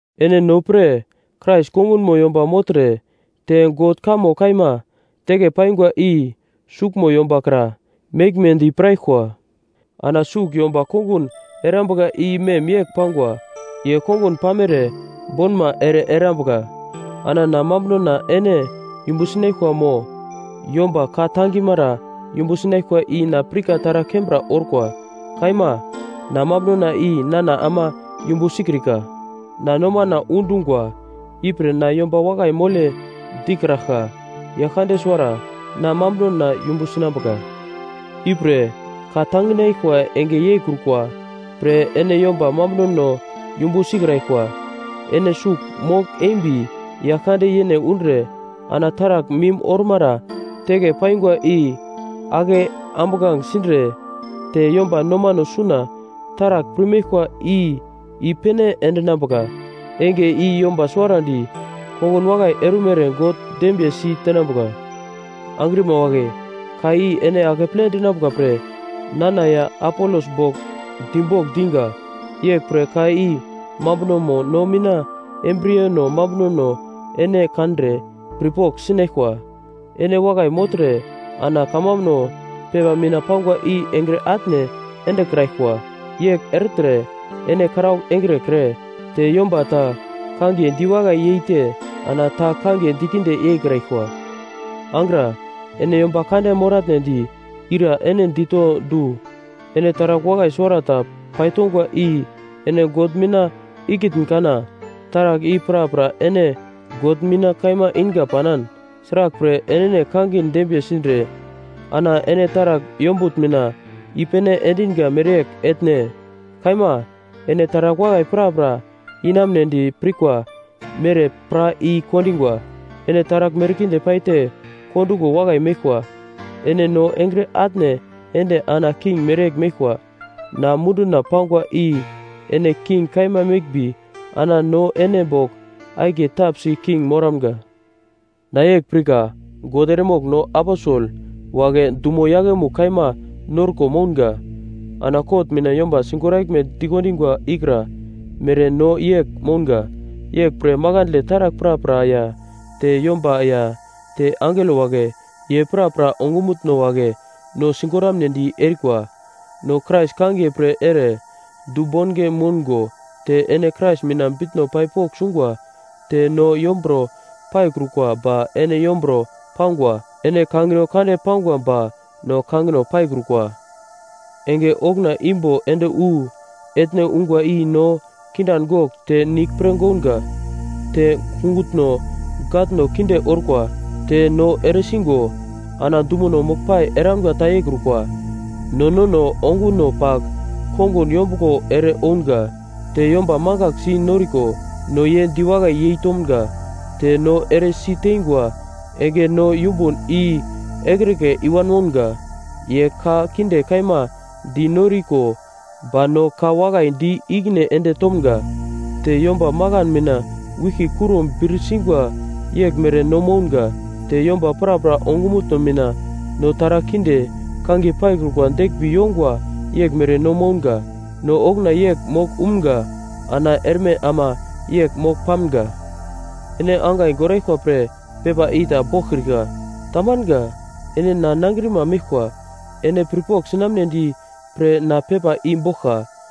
Ene no pre, Krais kongunmo yomba mogltre te God kamo kaima teke paingwa i suglmo yomba kra meglmedi piraglkwa. Ana sugl yomba kongun erambuka i mem yegl pangwa, ye kongun pamere bonma ere erambuka. Ana na mambunona ene yumbu sinaglkwa mo yomba ka-tangimara yumbu sinaglkwa i na pirka taragl kembra orkwa. Kaima, na mambunona i nana ama yumbu sikrika. Na nomana undungwa, ipre na yomba wakai mole dikraglka. Yaglkande suwara na mambunona yumbu sinambuka. Ipre, ka tanginaglkwa enge yeikrukwa pre ene yomba mambunono yumbu sikraglkwa. Ene sugl mogl-embi Yaglkande yene undre, ana taragl mim ormara teke paingwa i ake ambuglange sindre te yomba nomano suna taragl pirmeglkwa i i-pene endinambuka. Enge i yomba suwarandi kongun wakai erumere God dembiye si tenambuka. Angrima wagle, ka i ene akeple dinambuka pre nana ya Apolos bogl dibogl diga. Yeglpre ka i mambunomo no mina embriyeno mambunono ene kandre pirpogl sinaglkwa. Ene wakai mogltre ana kamambuno pepa mina pangwa i engre atne endekraglkwa. Yegl ertre ene karaugl engrekre te yomba ta kangiye diwakai yeite ana ta kangiye dikinde yeikraglkwa. Angra, ene yomba kande moratnedi ira ene dito du? Ene taragl wakai suwarata paitongwa i ene God mina ikitn kana? Taragl i prapra ene God mina kaima inga panan, sraglpre enene kangin dembiye sindre ana ene taragl yombutn mina i-pene endinga mereyegl etne? Kaima. Ene taragl wakai prapra inamunedi pirkwa mere pra i-kondingwa. Ene taragl merkinde paite kondungo wakai meglkwa! Ene no engre atne ende ana king mereyegl meglkwa. Na munduna pangwa i ene king kaima meglmbi ana no ene bogl akiye tapsi king moramga! Na yegl pirka, God eremogl no aposel wagle dumo yaglemugl kaima norko mounga. Ana kot mina yomba sigoraglme dikondingwa ikra mere no yegl mounga. Yeglpre makandle taragl prapra ya te yomba ya te angelo wagle, ye prapra ongumutno wagle no sigoramnedi erikwa. No Krais kangiye pre ere dubonge moungo te ene Krais mina bitno pai pogl sungwa! Te no yomburo paikrukwa ba ene yomburo pangwa! Ene kangino kande pangwa ba no kangino paikrukwa! Enge okuna imbo ende wu etne ungwa i no kindan gogl te nigl pre gounga, te kungutno gatno kinde orkwa, te no ere sigo ana dumono moglpai eramga ta yeikrukwa. No nono onguno pagl kongun yombuglo ere ounga. Te yomba mangaglsi noriko, no ye diwakai yeitomga. Te no eresi teingwa enge no yumbun i ekrike i-wan mounga. Ye ka kinde kaima di noriko ba no ka wakai di ikine ende tomga. Te yomba makan mina wiglki kuro bir singwa yeglmere no mounga. Te yomba prapra ongumutno mina no taragl kinde kangiye paikrukwa deglmbi yongwa yeglmere no mounga. No okuna yegl mogl umga ana erme ama yegl mogl pamga. Ene angai goraglkwa pre pepa i ta boglkrika. Tamanga. Ene na nangrima meglkwa, ene pirpogl sinaglmedi pre na pepa i boglka.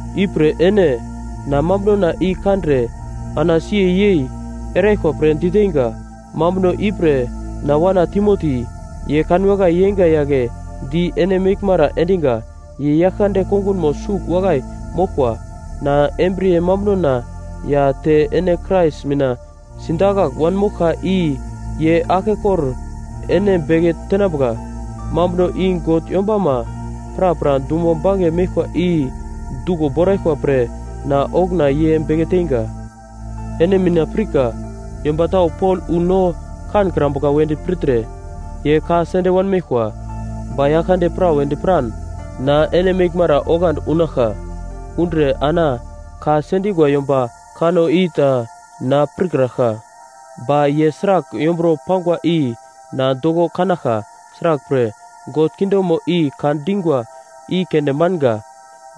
Ipre ene, na mambunona i kandre ana siye yei eraglkwa pre diteinga. Mambuno ipre na wana Timoti, ye kanwakai yeinga yagle di ene meglmara endinga. Ye Yaglkande kongunmo sugl wakai moglkwa. Na embriye mambunona ya te ene Krais mina sidakagl wanmoglka i ye aglkekor ene beke tenambuka. Mambuno i God yombama prapra dumo bange meglkwa i duglo boraglkwa pre na okuna ye beke teinga. Ene mina pirka yomba tau Pol wu no kankrambuka wedi pirtre ye ka sende wanmeglkwa. Ba yaglkande prawedi piran na ene meglmara oglandi unaglka. Undre ana ka sendingwa yomba kanno i ta na pirkraglka, ba ye sragl yomburo pangwa i na doko kanaglka. Sraglpre, God kingdomo i ka dingwa i keunde manga,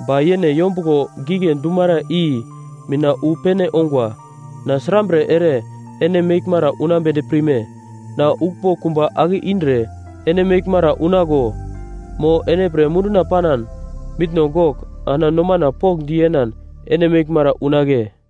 ba yene yombuglo gigle dumara i mina wu pene ongwa. Na srambre ere ene meglmara unambedi pirme? Na uglmbo kumba ake indre ene meglmara unaglo? Mo ene pre munduna panan, mitno gogl ana nomana pokndi yenan ene meglmara unagle?